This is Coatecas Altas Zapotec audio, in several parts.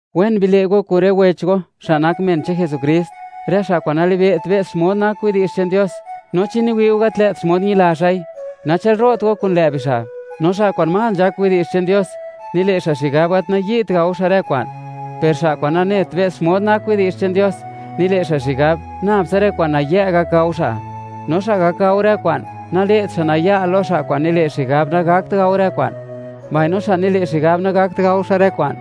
Wen bile' go kun rë wech go xa' nak men che'n Jesukrist, rë xa' kwa'n nalibe't be's xmod nak widi'zh che'n Dios; no chi niwi'u gat lë't xmod ñila xa'i, nachë'lro't go kun lë' bixa'. No xa' kwa'n más nzhak widi'zh che'n Dios, nile' xa' xigab, gat nayi't gao xa' rë kwa'n; per xa' kwa'n nanet be's xmod nak widi'zh che'n Dios, nile' xa' xigab, nab tsa rë kwa'n nayë' gak gao xa'. No xa' gak gao rë kwa'n, nale't xa' naya' lo xa' kwa'n nile' xigab, nagakt gao rë kwa'n; mbaino xa' nile' xigab, nagakt gao xa' rë kwa'n,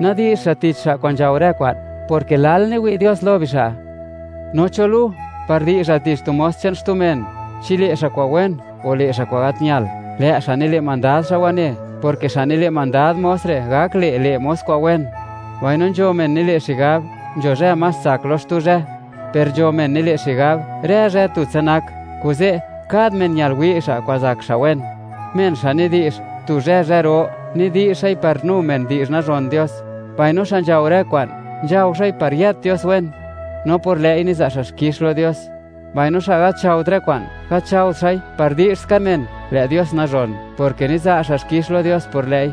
nadi'zht xa' tich xa' kwa'n nzhao rë kwa'n, porke lal niwi' Dios lo bixa'. No, ¿cho lu, par di'zhal tich tu mos che'n xtu men? Chi le' xa' kwa'n wen, o le' xa' kwa'n gat ñal, lë' xa' nile' mandad xa' wane; porke xa' nile' mandad mos re' gak le', le' mos re' kwa'n wen. Mbaino nzho men nile' xigab, nzho zhë más tsak lo xtu zhë, per nzho men nile' xigab, rë zhë tutsa nak. Kuze', kad men ñal wi' xa' kwa'n zak xa' wen. Men xa' nidi'zh: “Tu zhë, zhë ro”, nidi'zh xa'i par nu men di'zh nazhon Dios; mbaino xa' nzhao rë kwa'n, nzhao xa'i par yët Dios wen, no por lë'i niza' xa' xkix lo Dios. Mbaino xa' gat nzhaot rë kwa'n, gat nzhaot xa'i par di'zh ska men, lë' Dios nazhon, porke niza' xa' xkix lo Dios por lë'i.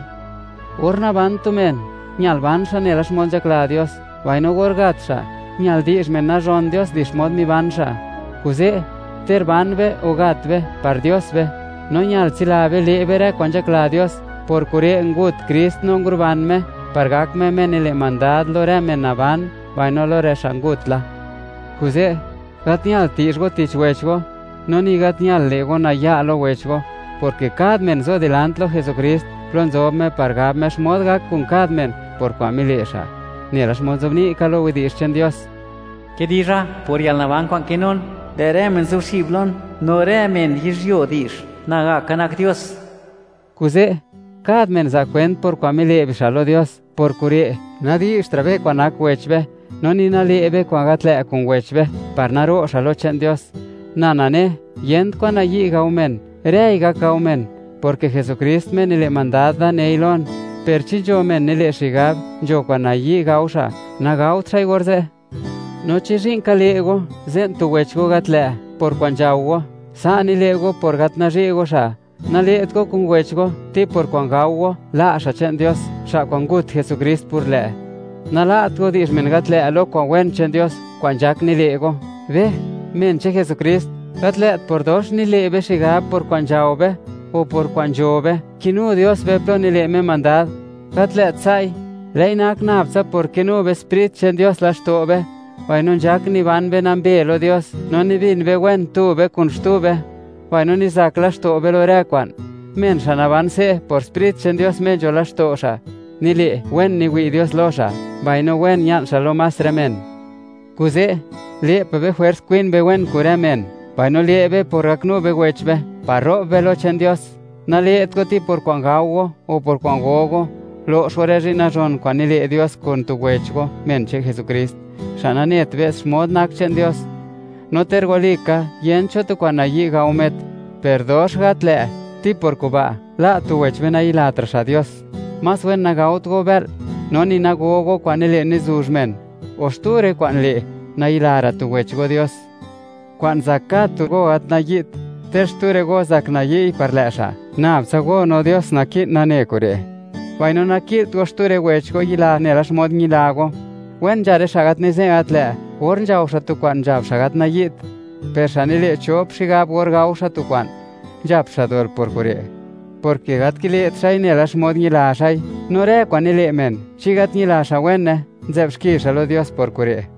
Or naban tu men, ñal ban xa' nela xmod nzhakla Dios, mbaino or gat xa', ñal di'zh men nazhon Dios di xmod miban xa'. Kuze', ter ban be o gat be, par Dios be, no ñal tsila be le' be rë kwa'n nzhakla Dios. Por kure', ngut Krist no nguruban Me, par gak Me, Me nile' mandad lo rë men naban, mbaino lo rë xa' ngut la. Kuze', gat ñalt di'zh go tich wech go, no ni gat ñal le' go naya' lo wech go, porke kad men zo dilant lo Jesukrist plo nzob Me par gab Me xmod gak kun kad men por kwa'n mile' xa'. Nela xmod nzobni' ka lo Yech che'n Dios: Kidizha por yalnaban kwa'n kinun: “Lë' rë men zuxib lon, no rë men yizhyuo di'zh, Nagaka nak Dios.” Kuze', kad men za' kwent por kwa'n mile' bixa' lo Dios. Por kure' nadi'zhtra' be kwa'n nak wech be, no ni nale' be kwa'n gat lë' kun wech be, par naro' xa' lo che'n Dios. Na nane, yent kwan nayi' gao men, rëi gak gao men; porke Jesukrist, Me nile' mandad da, nei lon. Per chi nzho men nile' xigab, nzho kwa'n nayi' gao xa', nagaot xa'i orze'. No chi zhi'n ka le' go, ze'n tu wech go gat lë' por kwa'n nzhao go, sa' nile' go por gat nazhi' go xa'. Nale't go kun wech go, ti por kwa'n gao go, la' xa' che'n Dios, xa' kwa'n ngut Jesukrist por lë'. Nala't go di'zh men gat lë' lo kwa'n wen che'n Dios, kwa'n nzhak nile' go. Be, men che'n Jesukrist, gat lë't por dox nile' be xigab por kwa'n nzhao be o por kwa'n nzho be, kinu Dios be plo nile' Me mandad. Gat lë't sa'i; lë'i nak nab tsa por kinu be Sprit che'n Dios laxto' be, mbaino nzhak niban be nambe lo Dios, no nibin be wen tu be kun xtu be, mbaino nizak laxto' be lo rë kwa'n. Men xa' naban se' por Sprit che'n Dios Me nzho laxto' xa', nile', wen niwi' Dios lo xa', mbaino wen ña'n xa' lo más rë men. Kuze', le' pa' be jwers kwin be wen kun rë men; mbaino le' be por gaknu be wech be, par ro'b be lo che'n Dios. Nale't go, ti por kwa'n gao go o por kwa'n go go, lo'x go rë zhi'n nazhon kwa'n nile' Dios kun tu wech go, men che'n Jesukrist, xa' nanet be's xmod nak che'n Dios. No ter walika, yent cho tu kwa'n nayi' gao met, per dox gat lë' ti por kuba', la' tu wech be nayilatra' xa' Dios. Más wen nagaot go bë'l, no ni nago go kwa'n nile' nizuzh men, o xtu rë kwa'n le', nayilara' tu wech go Dios. Kwa'n zak kad tu go gat nayi't, ter xtu rë go zak nayi'y par lë' xa', nab tsa go no Dios naki'n nane kure'; mbaino naki'lt go xtu rë wech go yila nela xmod ñila go. Wen nzha rë xa' gat nize'nt gat lë' or nzhao xa' tu kwa'n nzhab xa' gat nayi't. Per xa' nile' chop xigab or gao xa' tu kwa'n, nzhap xa' dol por kure', porke gat kile't xa'i nela xmod ñila xa'i. No rë kwa'n nile' men chi gat ñila xa' wene, nzë'b xki xa' lo Dios por kure'.